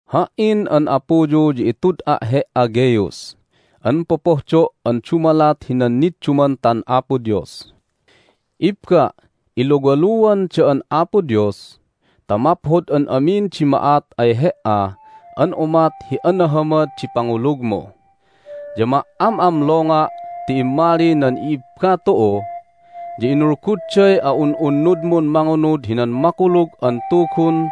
Ha"in an apuyu ya itud'a' he"a, Gaius, an popohdo' an dumalat hinan niddumantan Apo Dios. Ibba', iluwaluan da'an Apo Dios ta maphod an amin di ma'at ay he"a an umat hi anahamad di pangulugmu. Ya ma"am'amlonga' ti immali nan i'ibba tu'u, ya inulgudday a'un'unnudmun mangunud hinan Makulug an Tugun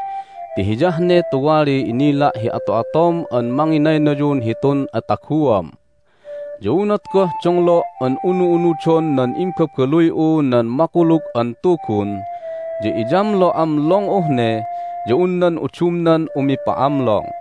ti hiyah ne tuwali inila' hi ato'atom an manginaynayun hitun ataguam. Ya unat goh donglo' an unu'unudon nan imbabaluy'u nan Makulug an Tugun ya iyamlo'amlong'uh ne ya un nan udumnan umipa'amlong.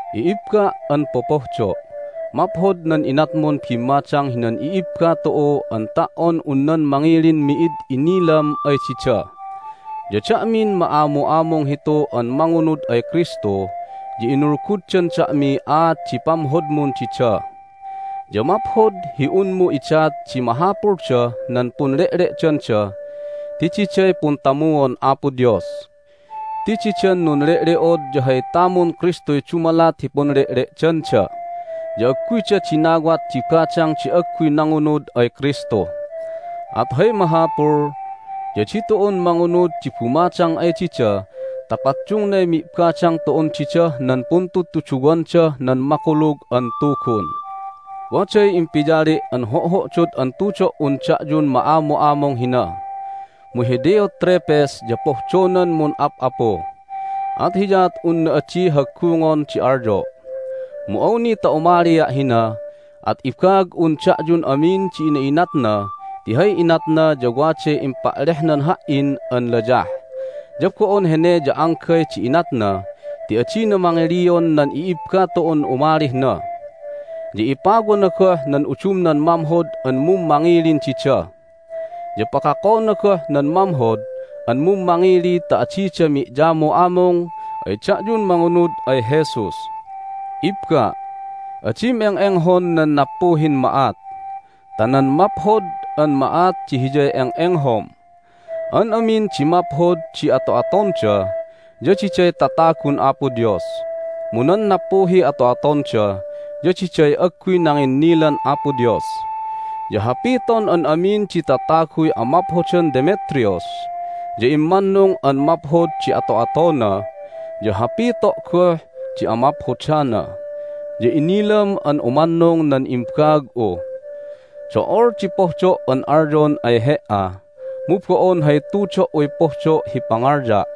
I'ibba' an popohdo', maphod nan inatmun bimmadang hinan i'ibba tu'u an ta"on un nan mangilin mi'id inilam ay dida. Ya da'min ma'amu'amung hitu an mangunud ay Kristu ya inulguddan da'miy aat di pamhodmun dida. Ya maphod hi unmu idat di mahapuldah nan punle'le'danda ti diday puntamuon Apo Dios. Ti didan nunle'le'od ya hay tamun Kristuy dumalat hi punle'le'danda, ya agguyda dinawat di badang di agguy nangunud ay Kristu. At hay mahapul ya ditu'un mangunud di bumadang ay dida ta paddungnay mi'badang tu'un didah nan puntudtuduwandah nan Makulug an Tugun. Waday impiyali' an ho'ho'dod an tudo"un da'yun ma'amu'amung hina. Mu hi Diotrephes ya pohdonan mun'ap'apu, at hiyaat unna adi haggungon di alyo'. Mu awni ta umalia' hina at ibaag'un da'yun amin di ina'inatna ti hay inatna ya waday impa'lehnan ha"in an layah! Ya bo'on hene ya anggay di inatna ti adina mangilion nan i'ibba tu'un umalih na, ya ipawana goh nan udumnan mamhod an mummangilin dida, ya pakakona goh nan mamhod an mummangili ta adida mi'yamu'amung ay da'yun mangunud ay Jesus! Ibba', adim eng'enghon nan nappuhin ma'at, ta nan maphod an ma'at di hiyay eng'enghom. An amin di maphod di ato'atonda ya diday tatagun Apo Dios, mu nan nappuhiy ato'atonda ya diday agguy nanginnilan Apo Dios. Ya hapiton an amin di tataguy amaphodan Demetrius, ya immannung an maphod di ato'atona, ya hapito' goh di amaphodana, ya inilam an umannung nan imbaag'u. Do'ol di pohdo' an alyon ay he"a, mu bo'on hay tudo"uy pohdo' hi pangalya'.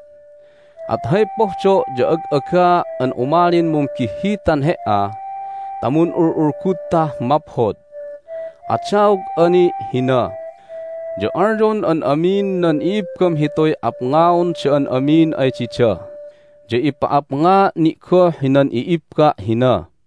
At hay pohdo' ya ag'agaa' an umalin mumbihhitan he"a ta mun'ul'ulgudtah maphod. Adaog'a ni' hina. Ya alyon an amin nan i'ibbam hituy apngaon da'an amin ay dida, ya ipa'apngaa' ni' goh hinan i'ibba' hina.